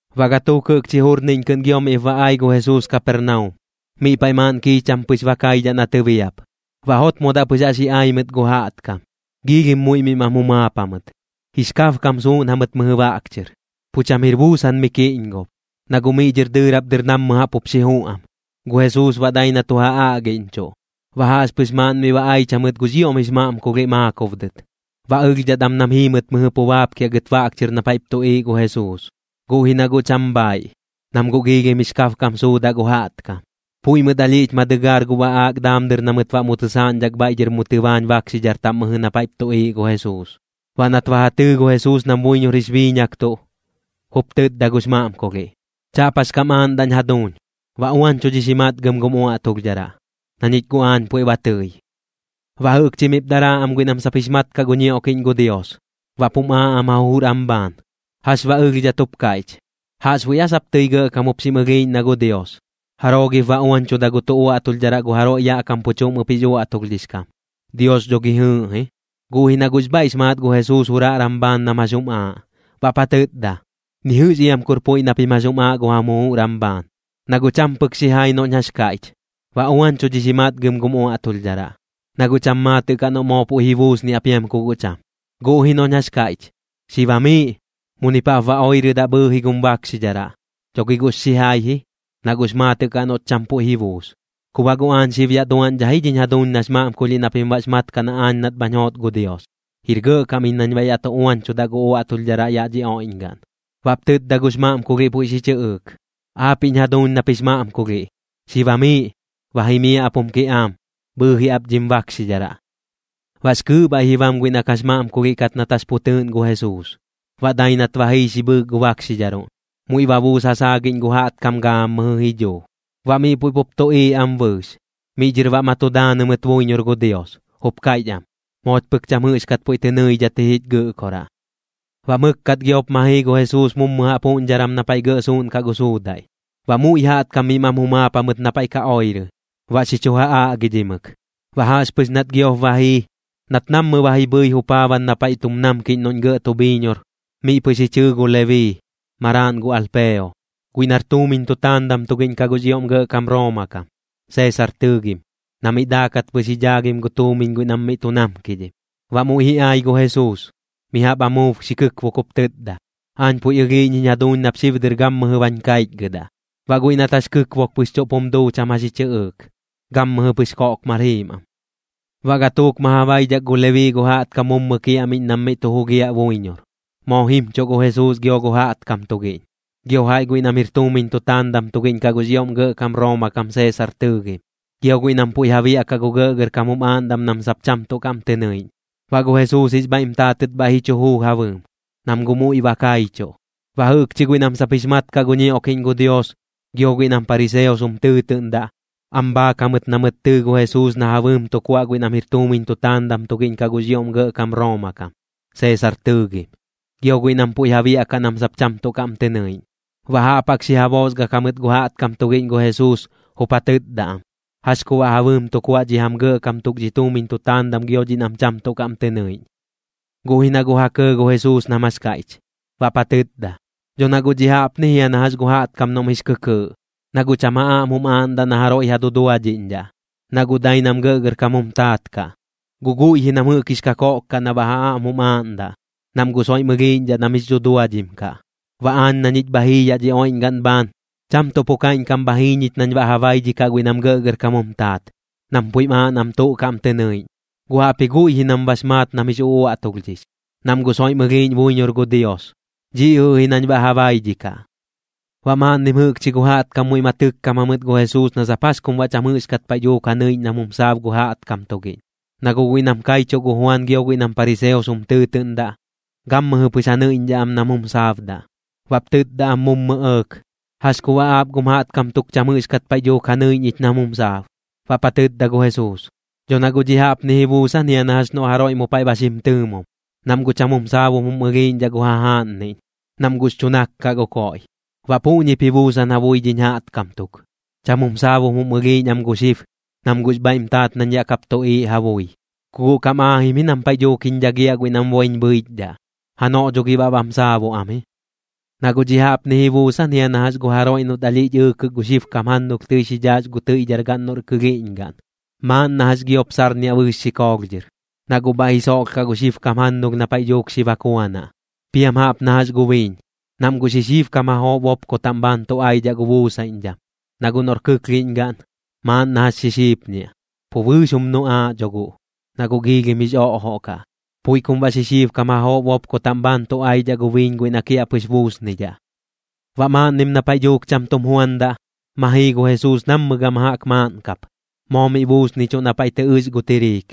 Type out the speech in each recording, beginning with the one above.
Baꞌ gatuuk jɨꞌkchi jurniꞌñ kɨꞌn gio miꞌp ba ai gu Jesuus Kapernaum. Miꞌ paiꞌ maaꞌn kiicham pɨx ba kaidhaꞌ na tɨbiap. Baꞌ jotmodaꞌ pɨx jaꞌx ji ai mɨt gu jaꞌtkam, giilhim muiꞌ miꞌ mam jumaap jamɨt. Jix kabkam suuꞌn jamɨt mɨjɨ baꞌk chɨr, pu cham jir buusan mi kiꞌñgob, na guꞌ miꞌ dhɨr dɨɨrap dɨr nammɨ jaꞌp jup xi juꞌ am. Gu Jesuus baꞌ dai na tu ja aꞌgiꞌñchuꞌ. Baꞌ jaꞌxpɨx maaꞌn miꞌ ba aich jamɨt gux ioꞌm jix maꞌmkulhiꞌ maakob dɨt. Baꞌ ɨlhdhat am nam jiimɨt mɨjɨ pu baapkiaꞌ gɨt baꞌk chɨr na paiꞌp tuꞌiiꞌ gu Jesuus, guꞌ ji na guꞌ cham bhaaiꞌ, nam guꞌ giilhim jix kabkam suudaꞌ gu jaꞌtkam. Puiꞌ mɨt alhiꞌch ma dɨgaar gu baꞌaak daam dɨr na mɨt baꞌ mu tɨsaaꞌñdhak bhaiꞌ dhɨr mu tɨbaañ bakxidhar taꞌm mɨjɨ na paiꞌp tuꞌiiꞌ gu Jesuus. Baꞌ nat ba ja tɨɨ gu Jesuus nam buiñor jix biiñaktuꞌ, jup tɨtda gux maꞌmkulhiꞌ: ―Chaꞌp jax kam aaꞌndaꞌñ jaduuñ. Ba uañchudhix ji matgam gum uaꞌtulhdharaꞌ, na ñich guꞌ aañ puiꞌ ba tɨi. Baꞌ jɨꞌkchi miꞌp daraa am guiꞌ nam sap jix mat kaꞌ gu ñioꞌkiꞌñ gu Dios, baꞌp jum aaꞌ am ja jujur am bhaan: “¿Jax baꞌ ɨlhdhat jup kaiꞌch? ¿Jaꞌxbuiꞌ aa sap tɨi gɇꞌkam jup xim ɨlhiiꞌñ na gu Dios? ¿Jaroo gip ba uañchuda gu tuꞌ uaꞌtulhdharaꞌ gu jaroiꞌ yaꞌ kam pu chuꞌm ɨp jix uaꞌtulhdhix kam? Dios dho gi jɨɨꞌ ji.” Guꞌ ji na guꞌx bhaiꞌx maat gu Jesuus juraꞌran bhaan nam jax jum aaꞌ, baꞌp ja tɨtda: ―Ni jɨꞌx iam kur puiꞌ na pim jax jum aaꞌ gu jam jujur am bhaan. Na guꞌ cham pɨk xijai noꞌñ jax kaiꞌch: “Ba uañchudhix ji matgam gum uaꞌtulhdharaꞌ”, na guꞌ cham maatɨꞌ kaꞌ noꞌ moo puiꞌ ji buusniaꞌ piam ku guꞌ cham. Guꞌ ji noꞌñ jax kaiꞌch: “Xi bamiiꞌ, munip jaꞌp ba oirɨdaꞌ bhɨɨji gum bakxidharaꞌ”, dho gi guꞌx xijai ji, na guꞌx maatɨꞌ kaꞌ noꞌt cham puiꞌ ji buus. Ku baꞌ guꞌ aañ xib yaꞌ duaꞌñdhaꞌ ji dhiñ jaduuñ nax maꞌmkulhiꞌ na pim bax mat kaꞌ na aañ nat bhañ joot gu Dios, jir gɇꞌkam iñ nañ baꞌ yaꞌ tu uañchudaꞌ gu uaꞌtulhdharaꞌ yaꞌ dhi oiꞌñgaꞌn. Baꞌp tɨtda gux maꞌmkulhiꞌ puiꞌ xi chɨꞌɨɨk: ―Aapiꞌñ jaduuñ nap jix maꞌmkulhiꞌ, xi bamiiꞌ. Ba jimiaꞌ ap jum kiꞌaam, bhɨɨji ap dhim bakxidharaꞌ. Baꞌx kɨɨꞌ bhaiꞌ ji bam guiꞌ na kax maꞌmkulhiꞌ kat nat jax pu tɨɨꞌn gu Jesuus. Baꞌ dai nat ba jii xi bhɨɨk gu bakxidharuꞌn, muiꞌ ba buus ja saagiꞌñ gu jaꞌtkam gaammɨjɨ ji dhuu. Baꞌ miꞌ puiꞌ pup tuꞌiiꞌ am bɨɨx, miꞌ dhɨr baꞌ ma tu daanɨ mɨt buiñor gu Dios, jup kaiꞌch am: ―¡Mooch pɨk cham jɨꞌxkat puiꞌ tɨ nɨidhat ji jich Gɨꞌkoraꞌ! Baꞌ mɨkkat gioꞌp ma jii gu Jesuus mummu jaꞌp juꞌñdharan na paiꞌ gɇꞌ suuꞌnkaꞌ gu suudaiꞌ. Baꞌ muiꞌ jaꞌtkam miꞌ mam jumaap jamɨt na paiꞌ ka oirɨ, baꞌ xi chu ja aꞌgidhimɨk. Baꞌ jaꞌxpɨx nat giop ba jii, nat nammɨ ba ji bhɨi jupaaban na paiꞌ tum namkiꞌñ noꞌñ gɇꞌ tu bhiiñor, miꞌ pɨx ji chɨɨ gu Lebii, maraaꞌn gu Alpeo, guiꞌ nar tuumiñ tu taandam tugiꞌñ kaꞌ gux ioꞌm gɇꞌkam Rooma kam, Seesar tɨɨgim, na miꞌ daakat pɨx ji dhaagim gu tuumiñ guiꞌ nam miꞌ tu namkidhim. Baꞌ muiꞌ ji ai gu Jesuus, mi jaꞌp amuub xi kɨkbuk jup tɨtda: ―Aañ puiꞌ ɨlhiiꞌñ jiñ jaduuñ nap xib dɨr gammɨjɨ bañ kaichgɨdaꞌ. Baꞌ guiꞌ nat jax kɨkbuk pɨx chuꞌp jum duu cham jax ji chɨꞌɨɨk, gammɨjɨ pɨx koꞌkmar jiim am. Baꞌ gatuuk ma ja baidhak gu Lebii gu jaꞌtkam mummu kiaꞌmiꞌñ nam miꞌ tu jugiaꞌ buiñor. Moo jimchuꞌ gu Jesuus gio gu jaꞌtkam tugiꞌñ, gio jaiꞌ guiꞌ nam jir tuumiñ tutaandam tugiꞌñ kaꞌ gux ioꞌm gɇꞌkam Rooma kam Seesar tɨɨgim, gio guiꞌ nam puiꞌ ja biaꞌkaꞌ gu gɇꞌgɇrkam jum aaꞌndam nam sap cham tuꞌ kaꞌm tɨ nɨiꞌñ. Baꞌ gu Jesuus jix bhaiꞌm taatɨt bhaiꞌ ji chu juu ja bɨɨm, nam guꞌ muiꞌ ba kaichuꞌ. Baꞌ jɨꞌkchi guiꞌ nam sap jix mat kaꞌ gu ñioꞌkiꞌñ gu Dios gio guiꞌ nam pariseos jum tɨɨtɨꞌndaꞌ, am bhaak jamɨt na mɨt tɨɨ gu Jesuus na ja bɨɨm tu kuaꞌ guiꞌ nam jir tuumiñ tutaandam tugiꞌñ kaꞌ gux ioꞌm gɇꞌkam Rooma kam, Seesar tɨɨgim, gio guiꞌ nam puiꞌ ja biaꞌkaꞌ nam sap cham tuꞌ kaꞌm tɨ nɨiꞌñ. Baꞌ jaꞌp jaꞌk xi ja boosgak jamɨt gu jaꞌtkam tugiꞌñ gu Jesuus, jup ja tɨtda am: ―¿Jax ku baꞌ ja bɨɨm tu kuaꞌ dhi jam gɇꞌkam tuk dhi tuumiñ tutaandam gio dhiꞌ nam cham tuꞌ kaꞌm tɨ nɨiꞌñ? Guꞌ ji na guꞌ ja kɇɇ gu Jesuus nam jax kaiꞌch, baꞌp ja tɨtda: ―Dho na guꞌ dhiꞌ jaꞌpni jia na jax gu jaꞌtkam noꞌm jix kɨkɨɨꞌ, na guꞌ cham ja aꞌm jum aaꞌndaꞌ na jaroiꞌ ja duduadhiꞌñdhaꞌ, na guꞌ dai nam gɇꞌgɇrkam jum taat kaꞌ. Guꞌ guiꞌ ji nam jɨꞌk jix kakoꞌk kaꞌ na baꞌ ja aꞌm jum aaꞌndaꞌ, nam guꞌ soiꞌm ɨlhiiꞌñdhaꞌ nam jix dhuduadhim kaꞌ. Baꞌ aañ na ñich bha jii yaꞌ dhi oiꞌñgaꞌn bhaan, cham tuꞌ pu kaiꞌñkam bha jii ñich nañ baꞌ ja baidhikaꞌ guiꞌ nam gɇꞌgɇrkam jum taat, nam puiꞌm aaꞌ nam tuꞌ kaꞌm tɨ nɨiꞌñ, guꞌ jaꞌpji guiꞌ ji nam jɨꞌk bax maat nam jix uꞌuaꞌtulhdhix, nam guꞌ soiꞌm ɨlhiiꞌñ buiñor gu Dios. Dhiꞌ jɨꞌ ji nañ baꞌ ja baidhikaꞌ. Baꞌ maaꞌnnim jɨꞌkchi gu jaꞌtkam muiꞌ ma tɨkkam jamɨt gu Jesuus na sap jax kum baꞌ cham jɨꞌxkat paiꞌ dhuuk ja nɨiꞌñ nam jum saab gu jaꞌtkam tugiꞌñ. Na guꞌ guiꞌ nam kaichuꞌ gu Juan gio guiꞌ nam pariseos jum tɨɨtɨꞌndaꞌ, gammɨjɨ pɨx ja nɨiꞌñdhaꞌ am nam jum saabdaꞌ. Baꞌp tɨtda am mummu ɇɇk: ―¿Jax ku baꞌ aap gum jaꞌtkam tuk cham jɨꞌxkat paiꞌ dhuuk ja nɨiꞌñ ich nam jum saab? Baꞌp ja tɨtda gu Jesuus: ―Dho na guꞌ dhiꞌ jaꞌpni ji buusan jia na jax noꞌ jaroiꞌ mu paiꞌ ba xim tɨɨmum, nam guꞌ cham jum saabum jum ɨlhiiꞌñdhaꞌ gu jajaaꞌnniꞌñ, nam guꞌx chu nak kaꞌ gu koiꞌ. Baꞌ puꞌñip ji buusan ja bui dhiñ jaꞌtkam tuk, cham jum saabum jum ɨlhiiꞌñ am gu xib, nam guꞌx bhaiꞌm taat nañ yaꞌ kap tuꞌiiꞌ ja bui. Ku guꞌ kam aajim ji nam paiꞌ dhuuk jiñ dhagiaꞌ guiꞌ nam boiñ bhɨichdhaꞌ, janoꞌ dho gi baꞌ bam saabuꞌ am ji. ’Na guꞌ dhiꞌ jaꞌpni ji buusan jia na jax gu jaroiꞌ noꞌt alhiꞌch ɨɨkɨk gu xibkam jannulh tɨi xi dhaax gu tɨiꞌdhargaꞌn noꞌr kɨlhiiꞌñgaꞌn. Maaꞌn na jax giop sarniaꞌ bɨɨx xikoolh dhɨr, na guꞌ bhaiꞌ ji soꞌlhkaꞌ gu xibkam jannulh na paiꞌ dhuuk xi bakuanaꞌ. Piam jaꞌp na jax gu biiñ, nam guꞌ xixiibkam jajoꞌ bopko bhaan tu aidhaꞌ gu buusaiꞌñdham, na guꞌ noꞌr kɨklhiꞌñgaꞌn, maaꞌn na jax xixiipñiaꞌ, pu bɨɨx jum nuꞌaaꞌ dho guꞌ, na guꞌ giilhim jix oꞌjoꞌ kaꞌ. Puiꞌ kum baꞌ xixiibkam jajoꞌ bopko taꞌm bhaan tu aidhaꞌ gu biiñ guiꞌ na kiaꞌpɨx buusnidhaꞌ. Baꞌ maaꞌnnim na paiꞌ dhuuk cham tum juandaꞌ, ma jii gu Jesuus nammɨ gama jaꞌk maaꞌn kap, moo miꞌ buusnichuꞌ na paiꞌ tɨ ɨx gu tiriik.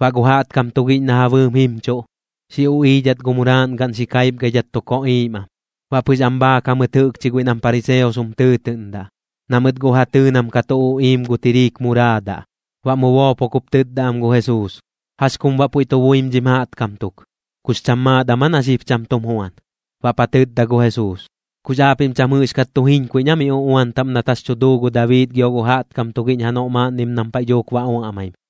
Baꞌ gu jaꞌtkam tugiꞌñ na ja bɨɨm jimchuꞌ, xi uꞌiidhat gu muraaꞌn gaꞌn xi kaipgaidhat tu koꞌiim am. Baꞌ pɨx am bhaak jamɨt jɨꞌkchi guiꞌ nam pariseos jum tɨɨtɨꞌndaꞌ, na mɨt guꞌ ja tɨɨ nam ka tu uꞌiim gu tiriik muraadaꞌ. Baꞌ mu boopok jup tɨtda am gu Jesuus: ―¿Jax kum baꞌ puiꞌ tu buim dhim jaꞌtkam tuk? ¿Kux cham maat am aa na xib cham tum juan? Baꞌp ja tɨtda gu Jesuus: ―¿Kux aapiꞌm cham jɨꞌxkat tu jiñkuiꞌñ aa miꞌ uꞌuan taꞌm nat jax tu duu gu Dabii gio gu jaꞌtkam tugiꞌñ janoꞌ maaꞌnnim nam paiꞌ dhuuk ba uaꞌmaim?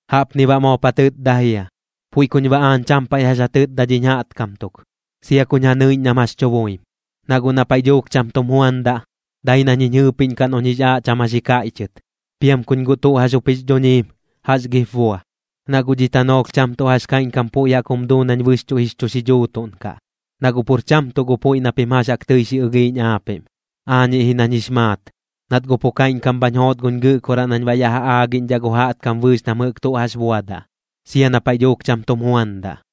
Jaꞌpni baꞌ moop ja tɨtda jia: ―Puiꞌ kuñ baꞌ aañ cham paiꞌ jax ja tɨtda dhiñ jaꞌtkam tuk, sia kuñ ja nɨiꞌñ nam jax tu buim. Na guꞌ na paiꞌ dhuuk cham tum juandaꞌ, dai nañ jiñ jɨɨpiꞌñkaꞌ noꞌñ jix aaꞌ cham jax ji kaiꞌchɨt. Piam kuñ guꞌ tuꞌ jax jup jix dhuñiim, ¿jax gip bua? Na guꞌ dhi tanoolh cham tuꞌ jax kaiꞌñkam puiꞌ jaꞌk jum duu nañ bɨxchuꞌ jix chu xidhuutuꞌn kaꞌ. Na guꞌ pur cham tuꞌ gu puiꞌ na pim jax jaꞌk tɨi xi ɨlhiiꞌñ aapiꞌm. Aañiꞌ ji nañ jix maat, nat guꞌ pu kaiꞌñkam bhañ joot guñ Gɨꞌkoraꞌ nañ baꞌ yaꞌ ja aagiꞌñdhaꞌ gu jaꞌtkam bɨɨx nam jɨꞌk tuꞌ jax buadaꞌ, sia na paiꞌ dhuuk cham tum juandaꞌ.